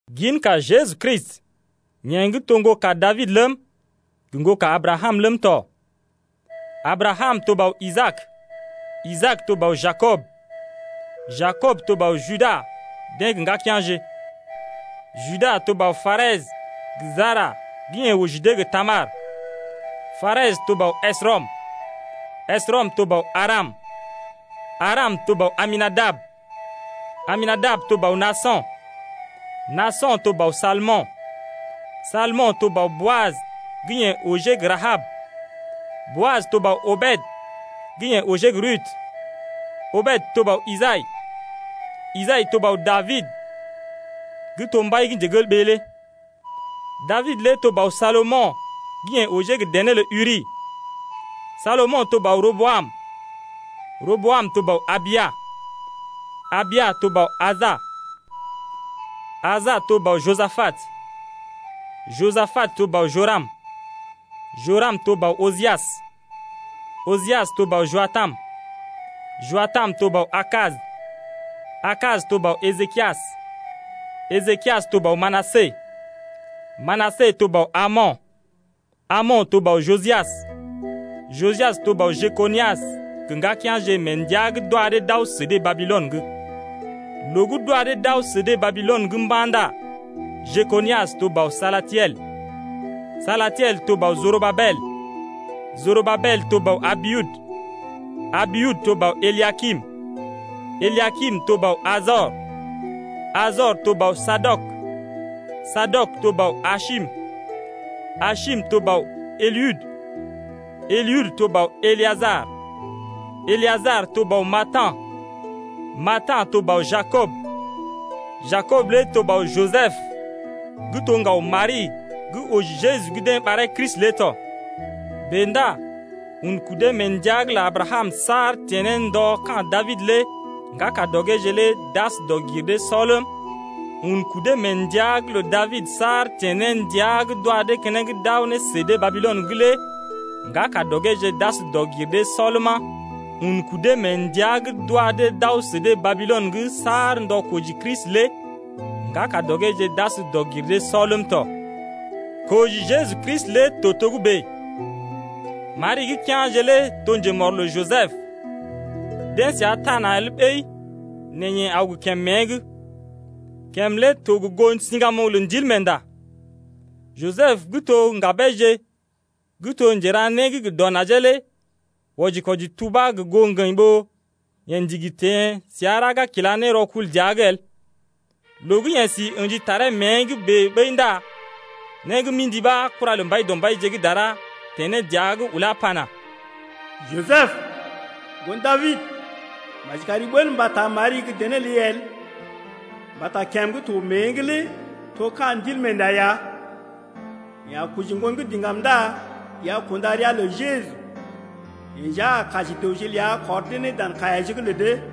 Ginka Jeju Kristi, yeḛ gə́ to ŋgoka Dabid ləm, gə ŋgoka Abrakam ləm tɔ. Abrakam to bɔ Isaak, Isaak to bɔ Jakob, Jakob to bɔ Juda deḛ gə ŋgakea̰je. Juda to bɔ Parɛs gə Jara gə́ yeḛ oji dee gə Tamar, Parɛs to bɔ Esrɔm, Esrɔm to bɔ Aram, Aram to bɔ Aminadab, Aminadab to bɔ Naaso̰, Naaso̰ to bɔ Salmo̰, Salmo̰ to bɔ Boaj gə́ yeḛ ojee gə Rahab, Boaj to bɔ Obed gə́ yeḛ ojee gə Rudu, Obed to bɔ Isai, Isai to bɔ Dabid gə́ to mbai lé. Dabid lé to bɔ Salomo̰ gə́ yeḛ ojee gə dené lə Uri, Salomo̰ to bɔ Roboam, Roboam to bɔ Abia, Abia to bɔ Asa, Asa to bɔ Josapat, Josapat to bɔ Joram, Joram to bɔ Ojias, Ojias to bɔ Joatam, Joatam to bɔ Ahas, Ahas to bɔ Ejekias, Ejekias to bɔ Manasə, Manasə to bɔ Amo̰, Amo̰ to bɔ Josias, Josias to bɔ Jekonias gə ŋgakea̰je mee ndəa gə́ d’wa dee d’aw sə dee Babilɔn lé. Loo gə́ d’wa dee d’aw sə dee Babilɔn’g mba̰ ndá Jekonias oji Salatiel, Salatiel oji Jorobabel, Jorobabel oji Abiud, Abiud oji Eliakim, Eliakim oji Ajor, Ajor oji Sadɔk, Sadɔk oji Asim, Asim oji Eliud, Eliud oji Eləajar, Eləajar oji Matan, Matan oji Jakob, Jakob lé oji Jisəb gə́ to ŋgaw Mari gə́ oji Jeju gə́ deḛ ɓaree Kristi lé tɔ. Bèe ndá un kudee mee ndəa’g lə Abrakam saar teḛ ne ndɔ ka̰ Dabid’g lé ŋgakadɔgeeje lé d’as dɔg-gir-dee-sɔ ləm, un kudee mee ndəa’g lə Dabid saar teḛ ne ndəa gə́ d’wa dee keneŋ d’aw ne sə dee Babilɔn’g lé ŋgakadɔgeeje d’as dɔg-gir-dee-sɔ ləma, un kudee mee ndəa gə́ d’wa dee d’aw dee Babilɔn’g saar ndɔ koji Kristi lé ŋgakadɔgeeje d’as dɔg-gir-dee-sɔ ləm tɔ. Koji Jeju Kristi lé to togə́bè: Mari gə́ kea̰je lé to njemɔr lə Jisəb, deḛ səa taa na̰ el ɓəi nɛ yeḛ aw gə kèm mée’g: kèm lé to gə goo siŋgamoŋ lə Ndilmeenda. Jisəb gə́ to gə́ ŋgabeeje gə́ to njera né gə dɔ najee lé wɔji-kwɔji tubá gə goo ŋgəḭ ɓó yeḛ ndigi teḛ səa raga kila ne rɔkul dəa’g el. Loo gə́ yeḛ si ə̰ji taree mée’g bèe ɓəi ndá né gə́ mḭdi ɓa kura lə Mbaidɔmbaije gə́ dara teḛ ne dəa’g ulá ne pana: Jisəb, ŋgon Dabid, maji kari ɓəl mba taa Mari gə́ dené ləi el mbata kèm gə́ to mée’g lé to ka̰ Ndilmeenda ya. Yeḛ a koji ŋgon gə́ diŋgam ndá i a kunda ria lə Jeju. Yeḛ nja a kaji dəwje ləa kɔr dee ne dan kaiyaje’g lə dee.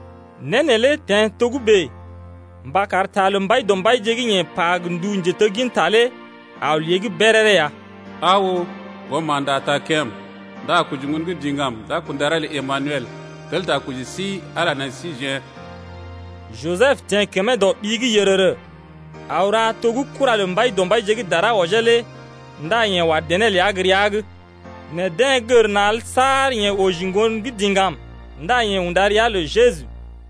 Né neelé teḛ togə́bè mba kar ta lə Mbaidɔmbaije gə́ yeḛ pa gə ndu njetegginta lé aw lée’g béréré ya: Aa oo, ŋgoma̰də a taa kèm ndá a koji ŋgon gə́ diŋgam, D’a kunda ria lə Emanuɛl (tel ta koji sí, Ala nai sə síjeḛ). Jisəb teḛ kəmee dɔ ɓi’g yərərə, aw ra to gə́ kura lə Mbaidɔmbaije gə́ dara wɔjee lé ndá yeḛ wa dené ləa gə́ rəa’g. Nɛ deḛ gər na̰ el saar yeḛ oji ŋgon gə́ diŋgam ndá yeḛ unda ria lə Jeju.